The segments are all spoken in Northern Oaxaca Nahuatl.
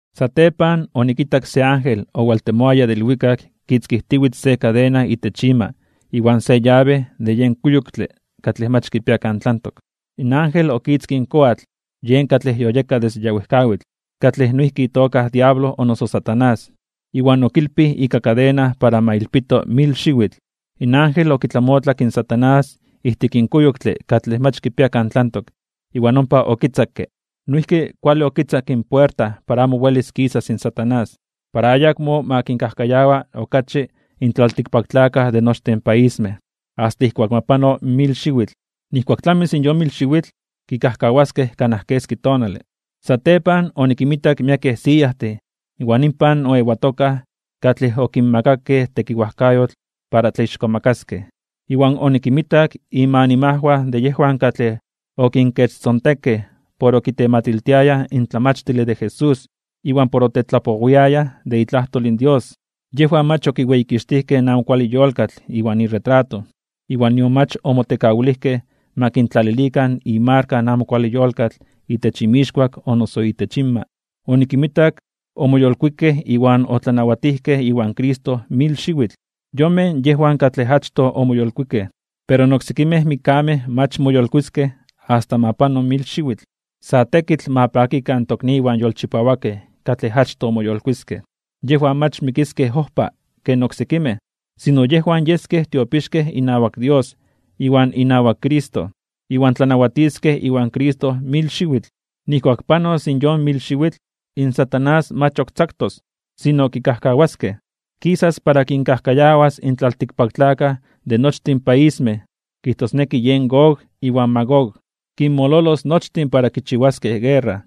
Satepan onikitak se ángel owaltemoaya de ilwikak kitzkijtiwitz se kadena itech ima iwan se yabe de yen kuyoktle katlej mach kipia kan tlantok. In ángel okitzkij in koatl, yen katlej yoyeka desde ya wejkawitl, katlej noijki itoka diablo o noso Satanás, iwan okilpij ika kadena para ma ilpito mil xiwitl. In ángel okitlamotlak in Satanás ijtik in kuyoktle katlej mach kipia kan tlantok iwan ompa okitzakke. Noijki kuale okitzakke in puerta para amo welis kisas in Satanás, para ayakmo ma kinkajkayawa okachi in tlaltikpaktlakaj de nochtin paismej, asta ijkuak ma pano mil xiwitl. Nijkuak tlamis in yon mil xiwitl, kikajkawaskej kanaj keski tonale. Satepan onikinmitak miekej siyajtin iwan inpan oewatokaj katlej okinmakakej tekiwajkayotl para tlaixkomakaskej (tlatzonmanaskej). Iwan onikinmitak inmanimajwan de yejwan katlej okinkechtzontekej por okitematiltiayaj in tlamachtile de Jesús iwan por otetlapowiayaj de itlajtol in Dios. Yejwan mach okiweyikixtijkej in amo kuale yolkatl iwan iretrato, iwan nion mach omotekawilijkej ma kintlalilikan imarka in amo kuale yolkatl itech inmixkuak o noso itech inma. Onikinmitak omoyolkuikej iwan otlanawatijkej iwan Cristo mil xiwitl. Yonmej yejwan katlej achtoj omoyolkuikej. Pero in oksekimej mikkamej mach moyolkuiskej (moyolitiskej) asta ma pano in mil xiwitl. Sa tekitl ma pakikan in tokniwan yolchipawakej katlej achtoj moyolkuiskej. Yejwan mach mikiskej ojpa ken oksekimej, sino yejwan yeskej tiopixkej inawak Dios iwan inawak Cristo. Iwan tlanawatiskej iwan Cristo mil xiwitl. Nijkuak panos in yon mil xiwitl, Satanás mach ok tzaktos, sino kikajkawaskej. Kisas para kinkajkayawas in tlaltikpaktlakaj de nochtin paismej. Kijtosneki yen Gog iwan Magog. Kinmololos nochtin para kichiwaskej guerra.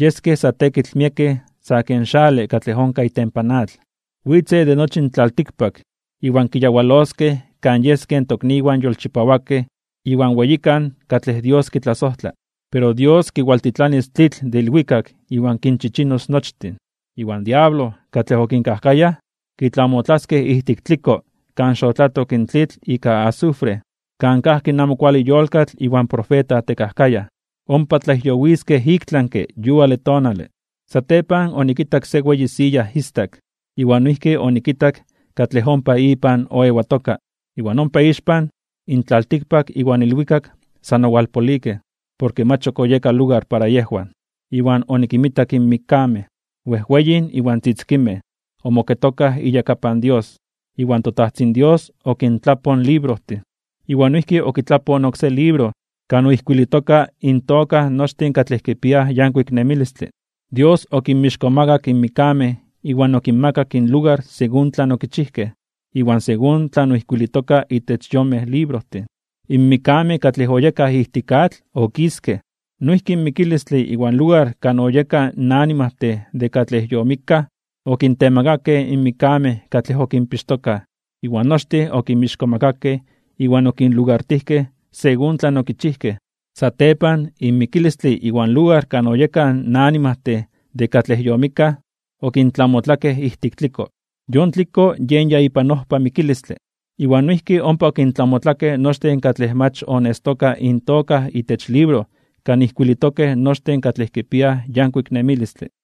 Yeskej sa tekitl miekej sa ken xale katlej onkaj itempan atl. Witzej de nochi in tlaltikpak iwan kiyawaloskej kan yeskej in tokniwan yolchipawakej iwan weyikan katlej Dios kitlasojtla. Pero Dios kiwaltitlanis tlitl de ilwikak iwan kinchichinos nochtin. Iwan diablo, katlej okinkajkayaj, kitlamotlaskej ijtik tliko kan xotlatok in tlitl ika azufre, kan kajki in amo kuale yolkatl iwan profeta tekajkayaj. Ompa tlajyowijtoskej iktlanke (ik tlami) yuale tonale. Satepan onikitak se weyi siya istak, iwan noijki onikitak katlej ompa ipan oewatoka. Iwan ompa ixpan, in tlaltikpak iwan ilwikak san owalpolikej, porke mach ok oyeka lugar para yejwan. Iwan onikinmitak in mikkamej, wejweyin iwan tzitzikinmej, omoketokaj iyakapan Dios. Iwan toTajtzin Dios okintlapoj in librojtin, iwan noijki okitlapoj in oksé libro kan oijkuilitokaj intoka nochtin katlej kipiaj yankuik nemilistle. Dios okinmixkomakak in mikkamej iwan okinmakak inlugar según tlan okichijkej, iwan según tlan oijkuilitoka itech yonmej librojtin. In mikkamej katlej oyekaj ijtik atl okiskej, noijki in mikilistle iwan lugar kan oyekaj animajtin de katlej yomikkaj, okintemakakej in mikkamej katlej okinpixtokaj. Iwan nochtin okinmixkomakakej iwan okinlugartijkej según tlan okichijkej. Satepan in mikilistle iwan lugar kan oyekaj in animajtin de katlej yomikkaj, okintlamotlakej ijtik tliko. Yon tliko yen ya ipan ojpa mikilistle. Iwan noijki ompa okintlamotlakej nochtin katlej mach onestokaj intoka itech libro kan ijkuilitokej nochtin katlej kipiaj yankuik nemilistle.